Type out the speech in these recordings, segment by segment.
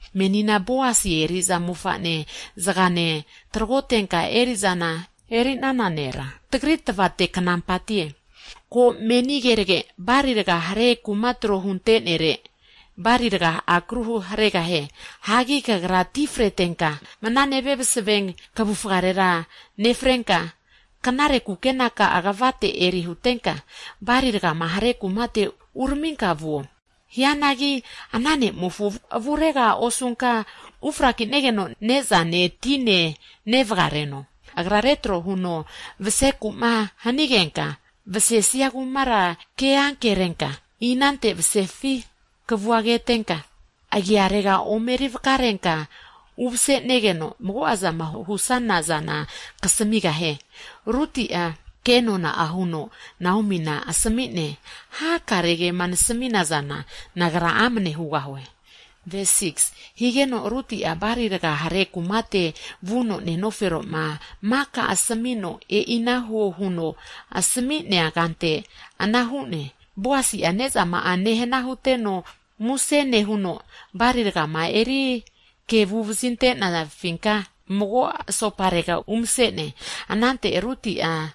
Menina Boasi eri'za mofa'ne zagane tragotenka eri'za eri'nana nera, tagri tvate knampatie. Ko! Meni keragera, bali raga hare kuma tro hunte'nere bali raga akru haregahie. Hagi kagra ti fretenka, mna nevia msave kvufarera nefrenka, knare kukenaka'a kvate eri hutenka, bali rgama hare kumate uraminka vuo. Hianagi, ana ne'mofo avurega osunka ufraki'negeno ne'zane, tinena nevaga reno. Hagi agra retro huno vaseku'ma hanigenka, vsesia kumara ke ankerenka, inante masesifi kavua ketenka, agiarega omeri vakarenka umase'negeno, mago'azama husana zana kasamigahie. Ruti'a, ke nona huno Naomina asmi'ne, Hakare kema nasmina zana, nagra amne hugahue. Higeno Ruti'a, bali raga hare kumate vuno nenofero'ma maka asmino, e'ina huo huno asmi'nea kante ana hu'ne. Boasi'a ne'zama'a nehna huteno muse nehuno, bali rgama eri kevu vazinte'pinka mago asoparega umse'ne. Anante Ruti'a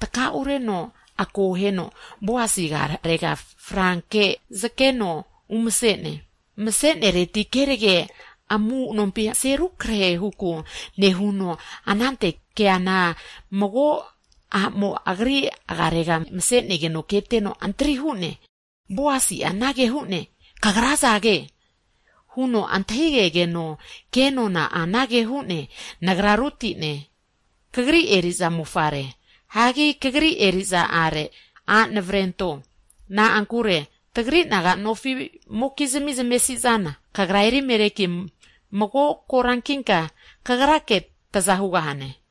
tkaureno ako heno, Boasi agarega frankera omeri zakeno umase'ne. Mase'nereti kerage amu'nompi mase rukrahe huku nehuno, anante keana mago a'mo agri agiarega mase'negeno keteno antri hu'ne. Boasi'a anage hu'ne, Kagra azage? Huno antahigegeno, ke nona'a anage hu'ne, Nagra Ruti'ne, kagri eri'za aki, a' navrento, na'ankure tagri naga nofi'mokizmi zamesi'zana, kagra Elimelekina mago korankinka, kagrake taza hugahane.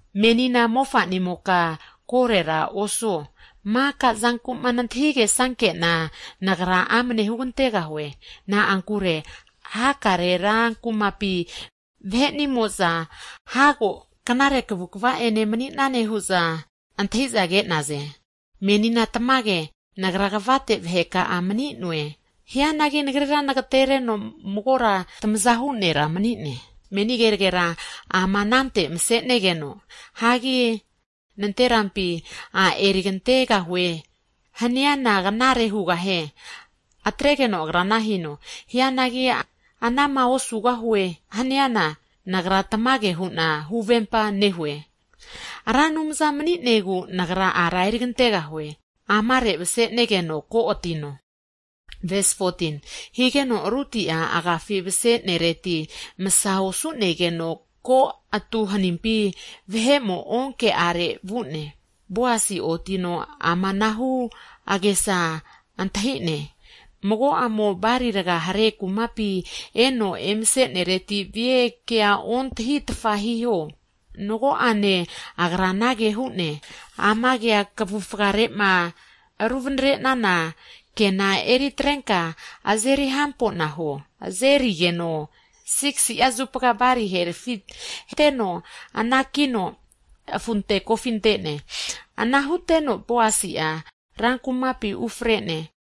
Menina mofa'nimoka korera osuo, maka zanku'ma nantahigesanke'na, nagra amne hugantegahue. Na'ankure hakare ra kumapi vahe'nimo'za hago knare kavukva ene a' mani'nane hu'za kage'za antahiza hu'naze. Menina tamage, nagra kvate vaheka'a mani'noe. Hianagi, nagrira nagatereno magora tamazahu nera mani'ne. Hagi meni kenagera ama anante masenegeno, masa hinkena nanterampi a' erigantegahue haniana knare hugahianki, atregeno agra ana hino. Hianagi anama osugahue'ma haniana, nagra tamage hu'na huvempa nehue, Ra Anumzama mani'negu nagra ara erigantegahue. Amare mase'negeno ko atino. Higeno Ruti'a agafi mase'nereti, masa osu'negeno ko'atu hanimpi vahe'mo onke'are vu'ne. Boasi'a otino amanahu ke asami'ne, mago a'mo bali raga hare kumapi eno emasenereti vie, kea ontahitfa hiho. Nago'ane agra anage hu'ne, amega kavufare'ma ruvanare'nana kena eritarenka azeri hampona huo, higeno azerigeno, 6si'a zupa balia herfi anteno anakino afunte kofi ante'ne. Ana huteno Boasi'a ra kumapi ufre'ne.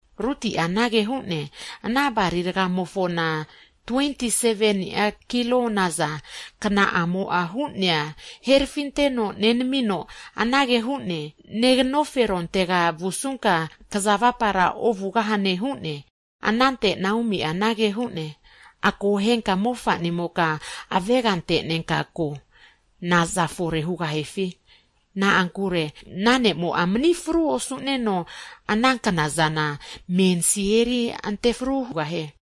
Ruti'a anage hu'ne, Ana bali rgamofona, 27ni'a kilo naza kna'amo'a hu'nea, herfinteno nenamino anage hu'ne, Neganoferontega vusunka, kza avapara ovugahane hu'ne. Hagi anante Naomi'a anage hu'ne, Akohenka mofa'nimoka avega ante'nenka ko, naza fore hugahifi. Na'ankure ana ne'mo'a mani fru osu'neno ana kna'zana mensi eri ante fru hugahie.